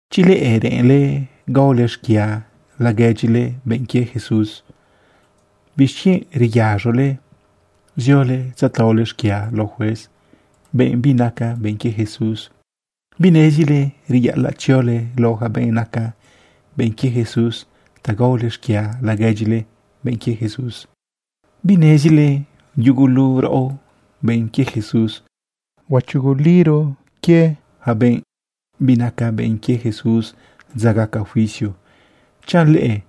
Chi leꞌe reꞌenle gaole xquia laguedyile benꞌ quie Jesús, ¿bixquienꞌ reyaz̃ole ziole tzataole xquia lao juez, benꞌ binaca benꞌ quie Jesús? ¿Binezile reyaꞌalaꞌ tziole lao yaca benꞌ naca benꞌ quie Jesús ta gaole xquia laguedyile benꞌ quie Jesús? ¿Binezile yugulu raꞌo, benꞌ quie Jesús, huachuguliro yaca benꞌ binaca benꞌ quie Jesús dza gaca juicio? Chanꞌ leꞌe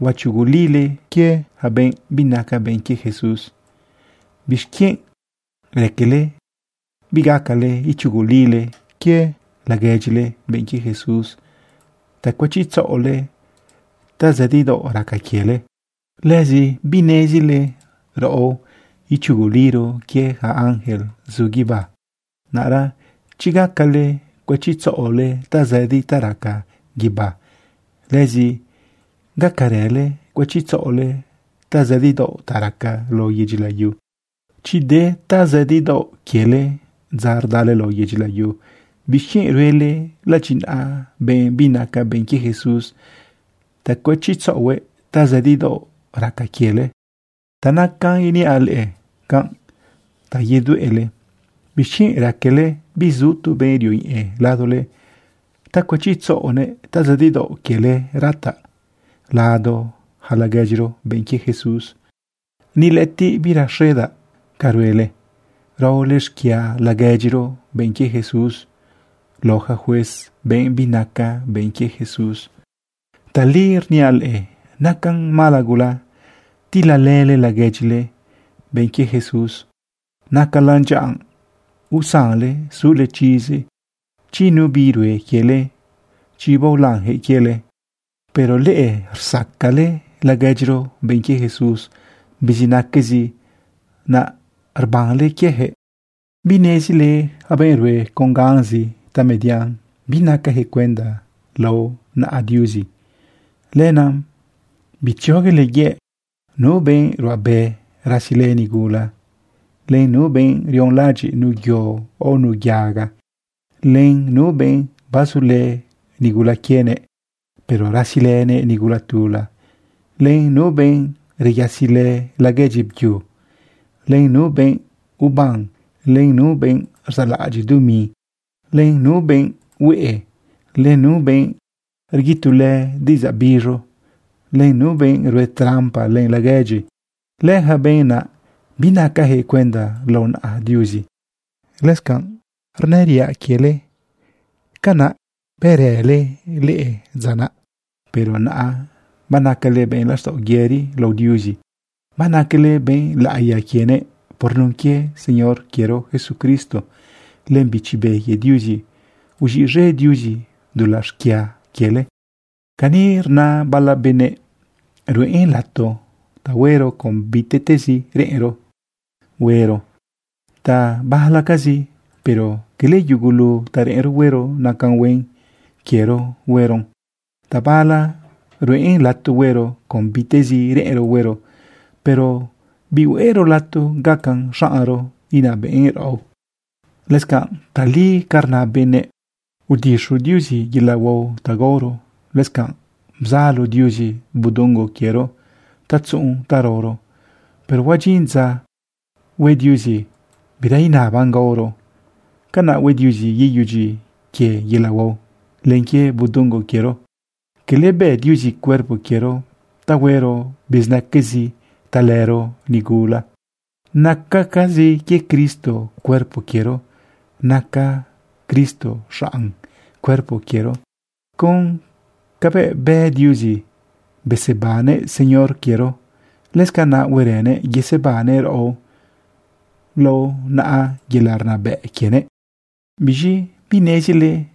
huachugulile yaca benꞌ binaca benꞌ quie Jesús, ¿bixquienꞌ raquele bigacale ichugulile laguedyile benꞌ quie Jesús ta cuëchitzaꞌole tazëdidaoꞌ raca quiele? ¿Lëzi binezile raꞌo ichuguliro quie yaca ángel zu guibá? Naꞌra chi gacale cuëchitzaꞌole tazëdi ta raca guibá, lëzi gacarële cuëchitzaꞌole tazëdidaoꞌ ta raca lao yedyi layu. Chi de tazëdidaoꞌ quiele dza rdale lao yedyi layu, ¿bixquienꞌ ruele ladyinaꞌa benꞌ binaca benꞌ quie Jesús ta cuëchitzaꞌohuëꞌ tazëdidaoꞌ raca quiele? Ta nacanꞌ iniaꞌ leꞌe canꞌ ta yedueꞌle. ¿Bixquienꞌ raquele bizu tu benꞌ rioñeꞌe ladole ta cuëchitzaꞌonëꞌ tazëdidaoꞌ quiele rataꞌ lado yaca laguedyiro, benꞌ quie Jesús? Ni lëꞌëtiꞌ birexedaꞌ ca ruele raole xquia laguedyiro, benꞌ quie Jesús, lao yaca juez, benꞌ binaca benꞌ quie Jesús. Tali rniaꞌ leꞌe, nacan mala gula tilalële laguedyile, benꞌ quie Jesús. Nacalan dyaꞌa usanle sule chizi chi nu bi rue quiele, chi baolanyaquëꞌ quiele. Pero leꞌe, rsacale laguedyiro, benꞌ quie Jesús, bizinaquezi, naꞌ rbanle quieyaquëꞌ. ¿Binezile yaca benꞌ rue con ganzi tamedian binacayaquëꞌ cuenda lao naꞌa Diuzi? Lenaꞌ bitzioguele yëꞌ. Nu benꞌ ruꞌabe rasilë nigula, len nu benꞌ rionlaꞌadyiꞌ nu yo o nu yaga, len nu benꞌ bazulë nigula quienëꞌ, pero rasilënëꞌ nigula tula, len nu benꞌ reyasilë laguedyi byu, len nu benꞌ uban, len nu benꞌ rzaꞌlaꞌadyiꞌ dumi, len nu benꞌ hueꞌe, len nu benꞌ rguitulë diꞌidzaꞌ biz̃u, len nu benꞌ rue trampa len laguedyi, leyaca benꞌ naꞌ, binacayaquëꞌ cuenda lao naꞌa Diuzi. Lëscanꞌ rnëriaꞌ quiele, canaꞌ bërële leꞌe dza naꞌ. Pero naꞌa banacale benꞌ laxtaꞌo yëri lao Diuzi, banacale benꞌ laꞌiya quienëꞌ. Por nun quie Señor quiero Jesucristo len Bichi Be quie Diuzi uz̃iꞌz̃e Diuzi dulaꞌ xquia quiele. Cani rna bala benëꞌ: “Ruꞌen lato ta huero con bitezi reꞌenro huero.” Tabalacazi, pero cala yugulu ta reꞌenro huero nacan huen quiero hueron. Tabala ruꞌen lato huero con bitezi reꞌenro huero, pero bihueꞌro lato gacan xaꞌnro inabëꞌn raꞌo. Lëscanꞌ tali ca rna benëꞌ: “Udixu Diuzi yelaꞌ huao ta gaoro. Lëscanꞌ bzalo Diuzi budungo quiero ta tzuꞌun ta raoro.” Pero huadyin dza hue Diuzi bira inaban gaoro. Canaꞌ hue Diuzi yeyudyi quie yelaꞌ huao len quie budungo quiero. Cala bë Diuzi cuerpo quiero ta huero bizinaquezi talëro nigula. Nacacazi quie Cristo cuerpo quiero. Naca Cristo xaꞌn cuerpo quiero. Con cabëꞌ bë Diuzi besebannëꞌ Señor quiero, lëscanaꞌ huerënëꞌ yesebannëꞌ raꞌo lao naꞌa yelaꞌ rnabëꞌ quiëꞌ. ¿Biz̃i binezile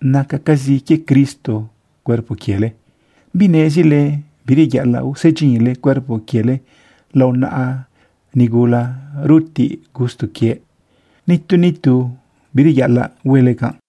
nacacazi quie Cristo cuerpo quiele? ¿Binezile bireyaꞌalaꞌ usedyinle cuerpo quiele lao naꞌa nigula rutiꞌ gusto quie? Nitu nitu bireyaꞌalaꞌ huele canꞌ.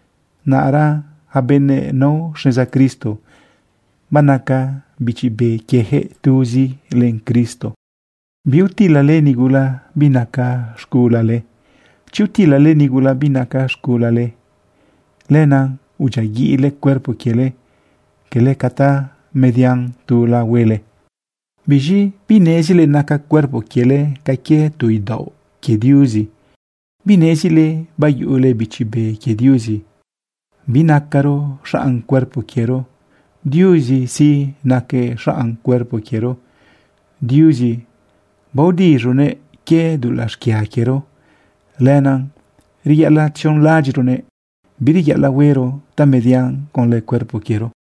Naꞌra yaca benëꞌ nao xneza Cristo, banaca bichi be quiejëꞌ tuzi len Cristo. Biutilale nigula binaca z̃gulale. Chi utilale nigula binaca z̃gulale, lenaꞌ udyiaguiꞌle cuerpo quiele, cala ca tamedian tula huele. ¿Biz̃i binezile naca cuerpo quiele ca quie tu idaoꞌ quie Diuzi? ¿Binezile bayuꞌule Bichi Be quie Diuzi? Binacaro xaꞌn cuerpo quiero. Diuzi sí, naquëꞌ xaꞌn cuerpo quiero. Diuzi baodiz̃uguëꞌ quie dulaꞌ xquia quiero. Lenaꞌ reyaꞌalaꞌ tzionlaꞌadyiꞌronëꞌ, bireyaꞌalaꞌ huero tamedian conlë cuerpo quiero.